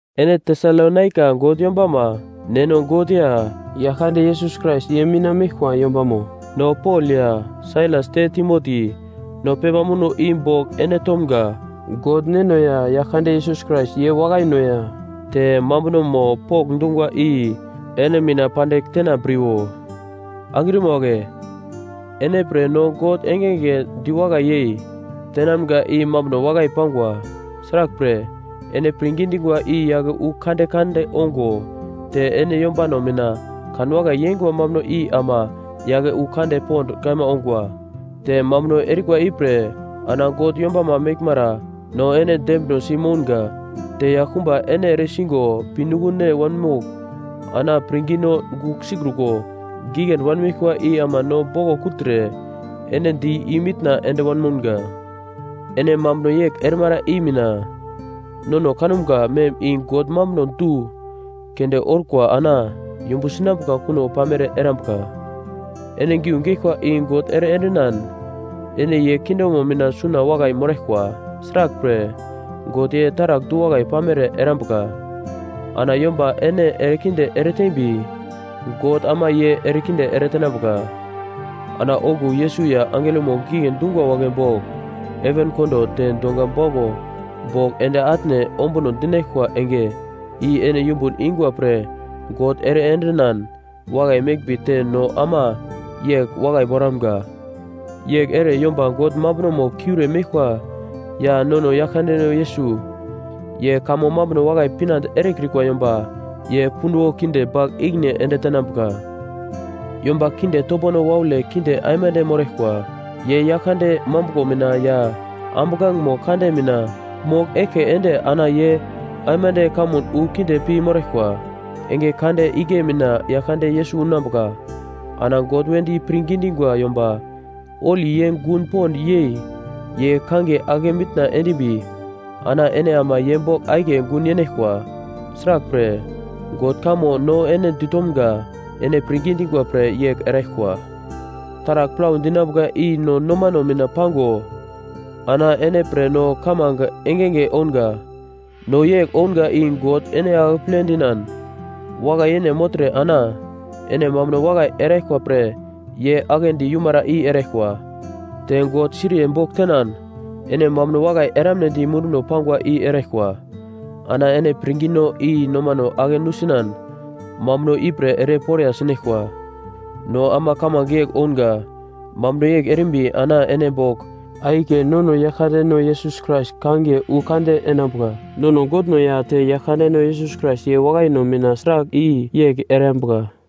Ene Tesalonaika God yombama Neno God ya Yaglkande Yesus Krais ye mina meglkwa yombamo. No Pol ya Sailas te Timoti no pepa muno i bogl ene tomga. God Neno ya Yaglkande Yesus Krais ye wakaino ya te mambunomo pokndungwa i ene mina pandigl tenambriwo. Angrima wagle, ene pre no God engenge diwakai yei tenamga i mambuno wakai pangwa. Sraglpre ene pirngi dingwa i yake wu kande kande ongo te ene yombano mina kanwakai yengwa mambuno i ama yake wu kande pond kaima ongwa. Te mambuno erikwa ipre ana God yombama meglmara no ene dembinosi mounga. Te yaglkumba ene eresigo pinuglone wanmogl ana pirngino gugl sikruko giglendi wanmeglkwa i ama no boglo kugltre ene di imitna ende wanmounga. Ene mambuno yegl erimara i mina, nono kanumga mem i God mambuno du keunde orkwa ana yumbu sinambuka kuno pamere erambuka. Ene giu geglkwa i God ere endinan ene ye kingdomo mina suna wakai moraglkwa. Sraglpre, God ye taragl du-wakai pamere erambuka, ana yomba ene erekinde ereteimbi God ama ye erekinde ere tenambuka. Ana okuwo Yesus ya angelomo gigle dingwa wagle bogl heven kondo te donga bauglo bogl ende atne ombuno dinaglkwa enge i ene yumbun ingwa pre God ere endinan wakai meglmbi te no ama yegl wakai moramga. Yegl ere yomba God mambunomo kiure meglkwa ya nono Yaglkandeno Yesus ye kamo mambuno wakai pinande erekrikwa yomba ye punduwo kinde bagl ikine ende tenambuka. Yomba kinde topono waule kinde aimande moraglkwa. Ye Yaglkande mambuglo mina ya ambuglangemo kande mina mogl eglke ende ana ye aimande kamun wu kinde pi moraglkwa. Enge kande igle mina Yaglkande Yesus unambuka. Ana God wedi pirngi dingwa yomba holi ye gun pond yei ye kangiye ake mitna endimbi ana ene ama ye bogl akiye gun yeinaglkwa sraglpre God kamo no ene ditomga ene pirngi dingwa pre yegl eraglkwa. Taragl plau dinambuka i no nomano mina pango ana ene pre no kamange engenge ounga. No yegl ounga i God ene akeple dinan wakai yene mogltre ana ene mambuno wakai eraglkwa pre ye aglendi yumara i eraglkwa. Te God siriye bogl tenan ene mambuno wakai eramnedi munduno pangwa i eraglkwa. Ana ene pirngino i nomano ake nusinan mambuno ipre ere poriya sinaglkwa. No ama kamange yegl ounga, mambuno yegl erimbi ana ene bogl akiye nono Yaglkandeno Yesus Krais kangiye wu kande enambuka. Nono Godno ya te Yaglkandeno Yesus Krais ye wakaino mina sragl i yegl erambuka.